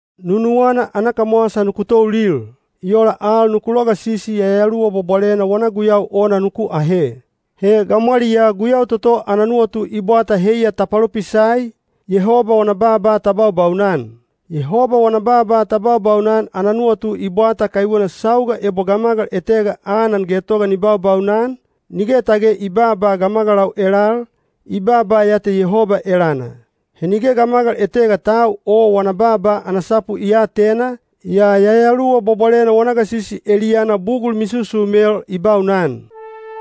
Nunuwana ana kamwasa nuku toulil. I ola al nuku logasisi Yayaluwa Bwabwalena wana guyau ona nuku ahe. He gamwaliyaa guyau toto ana nuwatu i bwata heiya ta palopisai, Yehoba wana baaba ta baubaunan. Yehoba wana baaba ta baubaunan ana nuwatu i bwata kaiwena sauga ebo gamagal etega anan getoga ni baubaunan, nige tage i baaba gamagalau elal, i baaba ya te Yehoba elana. He nige gamagal etega tau o wana baaba ana sapu i aatena, yaa Yayaluwa Bwabwalena wana gasisi eliyana bugul misusumel i baunan.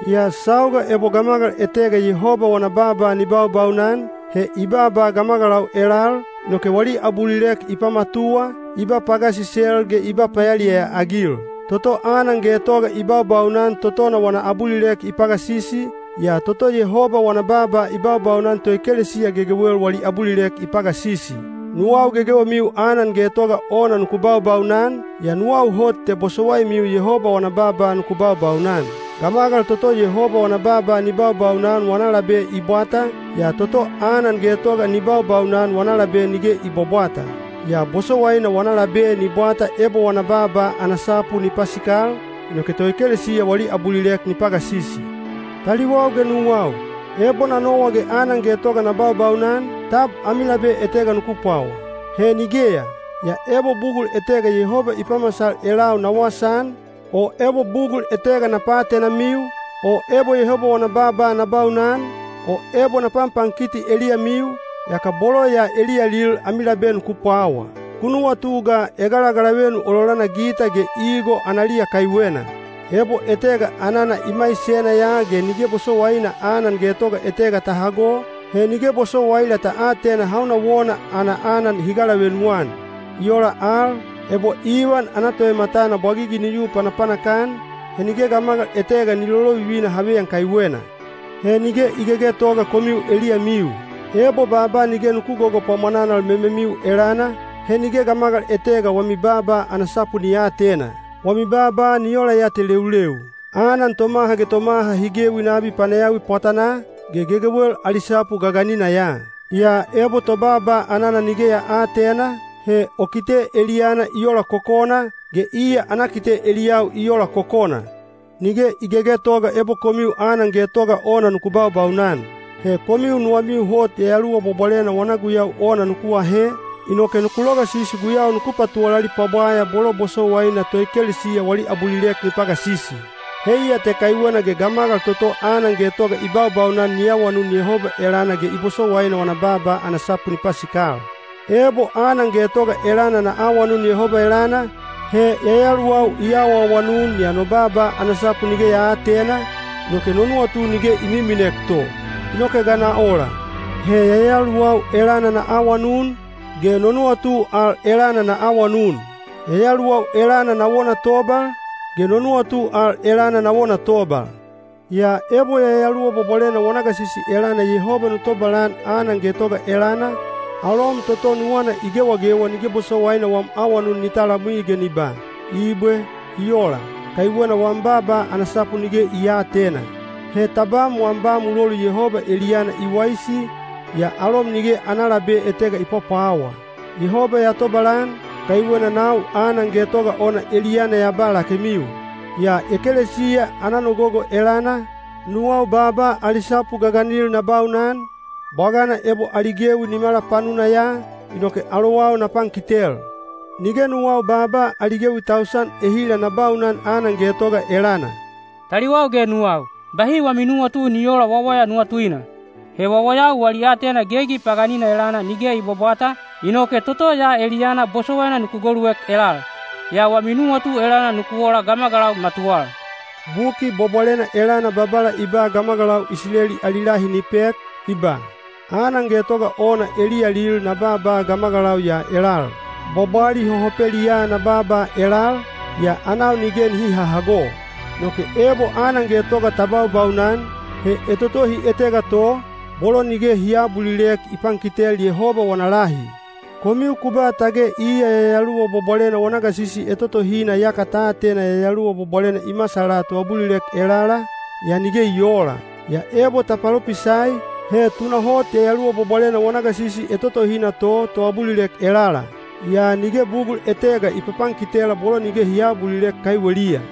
Yaa sauga ebo gamagal etega Yehoba wana baaba ni baubaunan, he i baaba gamagalau elal, inoke wali abulilek i pamatuwa, i ba pagasisel ge i ba payaliyaya-agil. Toto anan getoga i baubaunan totona wana abulilek i pagasisi, yaa toto Yehoba wana baaba i baubaunan toekelesiya gegewel wali abulilek i pagasisi. Nuwau gegewemiu anan getoga ona nuku baubaunan, yaa nuwau hot te bosowaimiu Yehoba wana baaba nuku baubaunan. Gamagal toto Yehoba wana baaba ni baubaunan wana labe i bwata, yaa toto anan getoga ni baubaunan wana labe nige i bwabwata. Yaa bosowaina wana labe ni bwata ebo wana baaba ana sapu ni pasikal, inoke toekelesiya wali abulilek ni pagasisi. Taliwau ge nuwau, ebo na nowa ge anan getoga na baubaunan, tab ami labe etega nuku pwawa? He nigeya! Yaa ebo bugul etega Yehoba i pamasal elau na wasaan, o ebo bugul etega na paatenamiu, o ebo Yehoba wana baaba na baunan, o ebo na panpankiti eliyamiu, yaka bolo ya eliyalil ami labe nuku pwawaa. Ku nuwatu ga egalagalavenu ololana gita ge igo analiya kaiwena. Ebo etega anana i maisena ya ge nige bosowaina ana getoga etega ta hago, he nige bosowaila ta atena hauna wona ana anan hi galavenu-an. I ola al, ebo ivan ana toematana bwagigi ni yu panapanak-an, he nige gamagal etega ni lolovivina haveyan kaiwena. He nige i gegetoga komiu eliyamiu. Ebo baaba nige nuku gogopwamwananal mememiu elana, he nige gamagal etega wami baaba ana sapu ni aatena. Wami baaba ni ola ya te leuleu. Anan tomaha ge tomaha hi gewi nabi panayawi pwatanaa, ge gegewel ali sapu gaganina ya. Yaa ebo tobaaba anana nige ya aatena, he o kite eliyana i ola kokona, ge iya ana kite eliyau i ola kokona. Nige i gegetoga ebo komiu anan getoga ona nuku baubaunan. He komiu nuwamiu hot Yayaluwa Bwabwalena wana guyau ona nuku ahe, inoke nuku logasisi guyau nuku patuwalali pwabwaya bolo bosowaina toekelesiya wali abulilek ni pagasisi. Heiya te kaiwena ge gamagal toto anan getoga i baubaunan ni awanun Yehoba elana ge i bosowaina wana baaba ana sapu ni pasikal. Ebo anan getoga elana na awanun Yehoba elana, he yayaluwau i awaawanun yaa no baaba ana sapu nige ya aatena, inoke no nuwatu nige i miminek to. Inoke ga na ola? He yayaluwau elana na awanun, ge no nuwatu al elana na awanun. Yayaluwau elana na wona tobal, ge no nuwatu al elana na wona tobal. Yaa ebo Yayaluwa Bwabwalena wana gasisi elana Yehoba nu tobalan anan getoga elana, alom toto nuwana i gewagewa nige bosowaina wam awanun ni talamwi ge ni ba “Ibwe. I ola.” Kaiwena wam baaba ana sapu nige i aatena. He tabam wam ba mulolu Yehoba eliyana i waisi, yaa alom nige ana labe etega i pwapwawa. Yehoba ya tobalan, kaiwena nau anan getoga ona eliyana ya ba lakemiu. Yaa ekelesiya ana nogogo elana, nuwau baaba ali sapu gaganil na baunan, bwagana ebo ali gewi nimala panuna ya, inoke alowau na pankitel. Nige nuwau baaba ali gewi tausan ehila na baunan anan getoga elana. Taliwau ge nuwau, bahi wami nuwatu ni oola wawaya nuwatuina. He wawayau wali aatena gegi paganina elana nige i bwabwata, inoke toto ya eliyana bosowaina nuku goluek elal. Yaa wami nuwatu elana nuku ola gamagalau matuwal. Buki Bwabwalena elana Babala i ba gamagalau Isileli ali lahi ni pek, i ba: Anan getoga ona eliyalil na baaba gamagalau ya elal. Bwabwali hohopeliyaa na baaba elal, yaa anau nige nihi hahago. Inoke ebo anan getoga ta baubaunan, he etotohi etega to, bolo nige hi aabulilek i pankitel Yehoba wana lahi. Komiu ku ba tage iya Yayaluwa Bwabwalena wana gasisi etotohina yaka ta atena Yayaluwa Bwabwalena i masala toabulilek elala, yaa nige i oola. Yaa ebo ta palopisai, he tunahot Yayaluwa Bwabwalena wana gasisi etotohina to toabulilek elala. Yaa nige bugul etega i papankitela bolo nige hi aabulilek kaiweliya.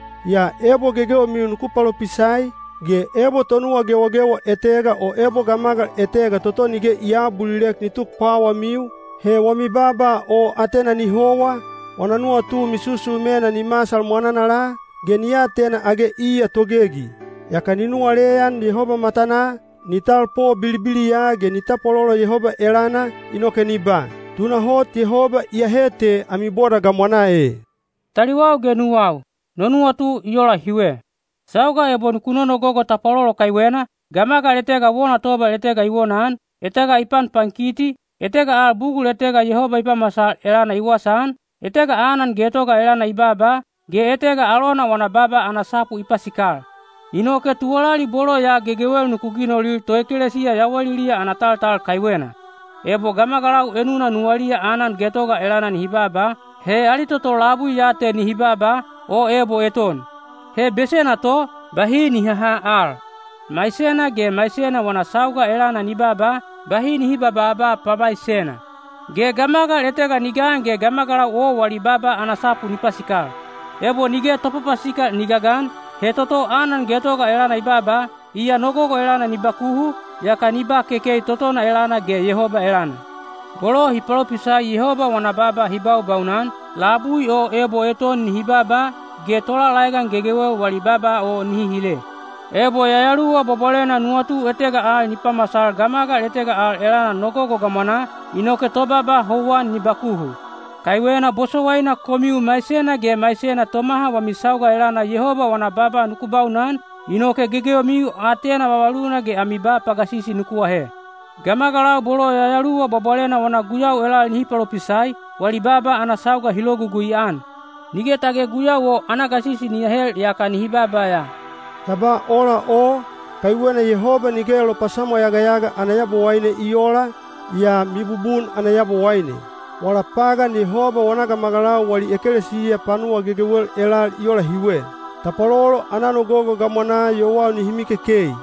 Yaa ebo gegewemiu nuku palopisai, ge ebo tonuwa gewagewa etega o ebo gamagal etega toto nige i aabulilek ni tuk pwawamiu, he wami baaba o atena ni howa, wana nuwatu misusumena ni masal mwananala, ge ni atena age iya togegi. Yaka ni nuwaleyan Yehoba matanaa, ni talpo bilibiliya ge ni tapwalolo Yehoba elana, inoke ni ba, “Tunahot Yehoba iyahe te ami boda gamwanaa e.” Taliwau ge nuwau, no nuwatu i ola hiwe. Sauga ebo ku nonogogo tapwalolo kaiwena, gamagal etega wona tobal etega i wonaan, etega i panpankiti, etega al bugul etega Yehoba i pamasal elana i wasaan, etega anan getoga elana i baaba, ge etega alona wana baaba ana sapu i pasikal. Inoke tuwalali bolo ya gegewel nuku ginolil toekelesiya yawaliliya ana taltal kaiwena. Ebo gamagalau enuna nuwaliya anan getoga elana nihi baaba, he ali toto labui ya te nihi baaba, o ebo eton. He besena to, bahi ni haha al. Maisena ge maisena wana sauga elana ni baaba, bahi nihi babaaba pamaisena. Ge gamagal etega ni gan ge gamagalau o wali baaba ana sapu ni pasikal. Ebo nige topapasikal ni gagan, he toto anan getoga elana i baaba, iya nogogo elana ni bakuhu, yaka ni ba kekei totona elana ge Yehoba elana. Bolo hi palopisai Yehoba wana baaba hi baubaunan, labui o ebo eton nihi baaba, ge tolalaegan gegewel wali baaba o nihi hile. Ebo Yayaluwa Bwabwalena nuwatu etega al ni pamasal gamagal etega al elana nogogo gamwanaa, inoke tobaaba houwan ni bakuhu. Kaiwena bosowaina komiu maisena ge maisena tomaha wami sauga elana Yehoba wana baaba nuku baunan, inoke gegewemiu aatena vavaluna ge ami ba pagasisi nuku ahe. Gamagalau bolo Yayaluwa Bwabwalena wana guyau elal nihi palopisai, wali baaba ana sauga hi logugui-an. Nige tage guyau o ana gasisi ni ahel yaka nihi baaba ya. Ya ba ola o, kaiwena Yehoba nige lopasamwayagayaga ana Yabowaine i oola, yaa mibubun ana Yabowaine. Wala pagan Yehoba wana gamagalau wali ekelesiya panuwa gegewel elal i ola hiwe. Tapwalolo ana nogogo gamwanaa yowau nihi mikekei.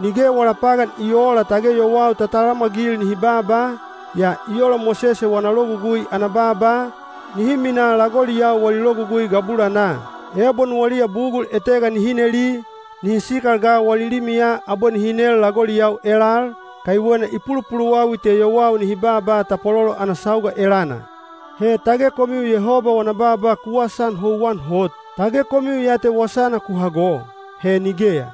Nige wala pagan i oola tage yowau ta talamwagil nihi baaba, yaa i ola Mosese wana Logugui ana baaba, nihi minaa lagoliyau wali logugui gabulanaa. Ebo nuwaliya bugul etega nihi neli, nihi sikal ga wali limiya abwe nihi nel lagoliyau elal, kaiwena i pulupuluwawi te yowau nihi baaba tapwalolo ana sauga elana. He tage komiu Yehoba wana baaba ku wasaan houwan hot? Tage komiu ya te wasana ku hago? He nigeya!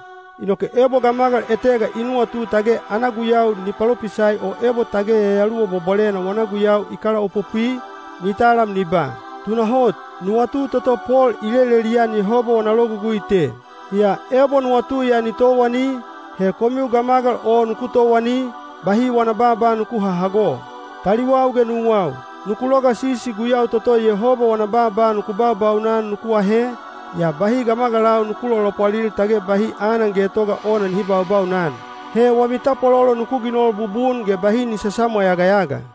Inoke ebo gamagal etega i nuwatu tage ana guyau ni palopisai o ebo tage Yayaluwa Bwabwalena wana guyau i kalaopopwi, ni talam ni ba, “Tunahot, nuwatu toto Pol i lelelian Yehoba wana logugui te.” Yaa ebo nuwatu ya ni towani, he komiu gamagal o nuku towani, bahi wana baaba nuku hahago. Taliwau ge nuwau, nuku logasisi guyau toto Yehoba wana baaba nuku baubaunan nuku ahe, yaa bahi gamagalau nuku lolopwalil tage bahi anan getoga ona nihi baubaunan. He wami tapwalolo nuku ginol bubun ge bahi ni sasamwayagayaga.